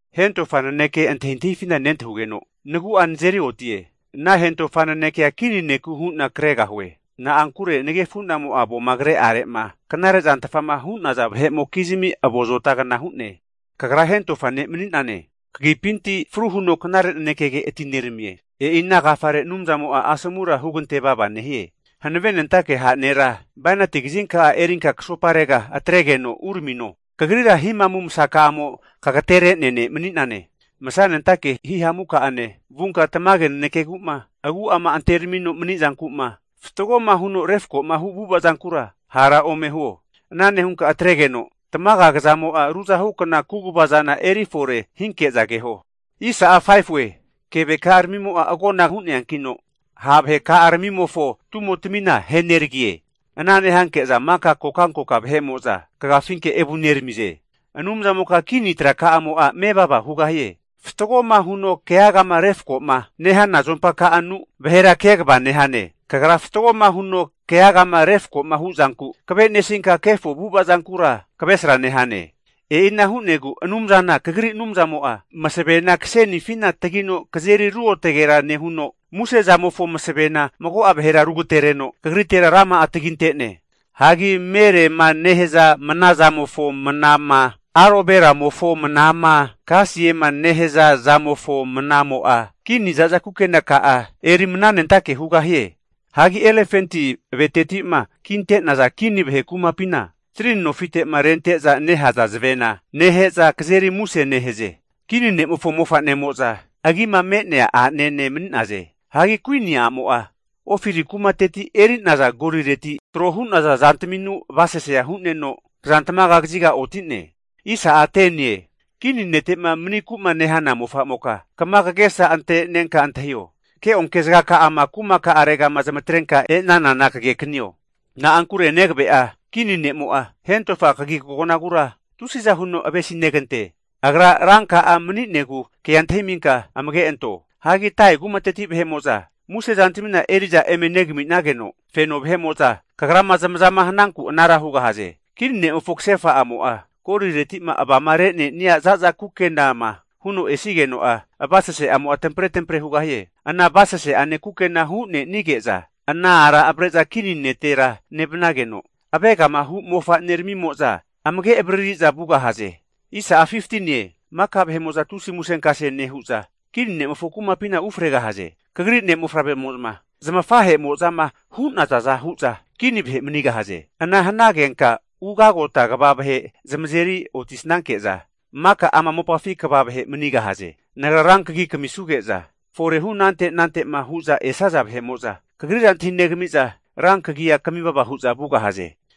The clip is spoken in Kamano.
Hentofa naneke antahintahifina nentahugeno, nagu'a nazeri otie. Ana hentofa nanekea kini neku hu'na kregahue. Na'ankure nagefunamo'a avoma kre'are'ma knarezantfama hu'naza vahe'mokizmi avo azotagna hu'ne. Kagra hentofa ne' mani'nane. Kagipinti fru huno knare nanekege atineramie. E'ina agafare Anumzamo'a asomura hugante vava nehie. Hankavenentake ha' nera bainati kazinka'a erinka kasoparega atregeno uramino! Kagrira hihamu masaka'amo kagatere'nea ne' mani'nane. Masanentake hihamuka'ane vunka tamage nanekegu'ma, agu'ama anteramino mani'zanku'ma, fatgoma huno refkoma hu avu'avakura hara ome huo. Ana nehunka atregeno, tamaga kzamo'a ruzahukna kaguvazana eri fore hinke'za keho. Keveka'aramimo'a agona hu'neankino ha' vaheka'aramimofo tumotmina ahe neragie. Ana nehanke'za maka kokankoka vahe'mo'za kagafinke evuneramize. Anumzamoka kini traka'amo'a mevava hugahie. Fatgoma huno keagama refkoma nehana azompaka'anu vahera kegava nehane. Kagra fatgoma huno keagama refkoma hu zanku kave'nesinka kefo avu'avazankura kavesra nehane. E'ina hu'negu Anumzana Kagri Anumzamo'a masavena kasenifina tagino kazeri ruotgera nehuno, musezamofo masavena mago'a vahera rugatereno kagritera rama'a taginte'ne. Hagi merema nehaza mnazamofo mnama, aloveramofo mnama, kasiema nehaza zamofo mnamo'a kini vahe'mo'za za'za kukenaka'a eri mnanentake hugahie. Hagi elefanti aveteti'ma kinte'naza kini vahe kumapina strini nofite'ma rente'za nehaza zavena nehe'za kazeri muse nehaze. Kini ne'mofo mofa'nemoza agima me'nea anene mani'naze. Hagi kuini a'mo'a Ofiri kumateti eri'naza golireti trohu'naza zantaminu avasasea hu'neno kazantamaga kaziga oti'ne. Kini netema maniku'ma nehana mofamoka kama kagesa antenenka antahio. Keonke zagaka'ama kumaka'aregama zamatrenka e'nanana kagekanio. Na'ankure negave'a, kini ne'mo'a hentofa kagikagonagura tusiza huno avesinegante. Agra ranka'a mani'negu ke'a antahiminka amage anto. Hagi Tairi kumateti musezantmina eri'za eme negami'nageno, feno vahe'mo'za kagrama zamazama hananku anara hugahaze. Kini ne'mofo kasefa a'mo'a goliretima avama renenia za'za kukenama huno esigeno'a, avasase'amo'a tampre tampre hugahie. Ana avasase'ane kukena hunenige'za ana ara avre'za kini netera nevnageno avegama hu' mofaneramimo'za amage avarariza vugahaze. Maka vahe'mo'za tusi musenkase nehu'za kini ne'mofo kumapina ufregahaze. Kagri ne' mofavremo'za zmafahe'mozama hu'nazaza hu'za kini vahe manigahaze. Ana hanagenka ugagota kva vahe zamazeri otisanke'za, maka ama mopafina kva vahe manigahaze. Nagra rankagi kamisuge'za forehu anante anante'ma hu'za esaza vahe'mo'za, kagrira antahinegamiza rankagia kamivava hu'za vugahaze.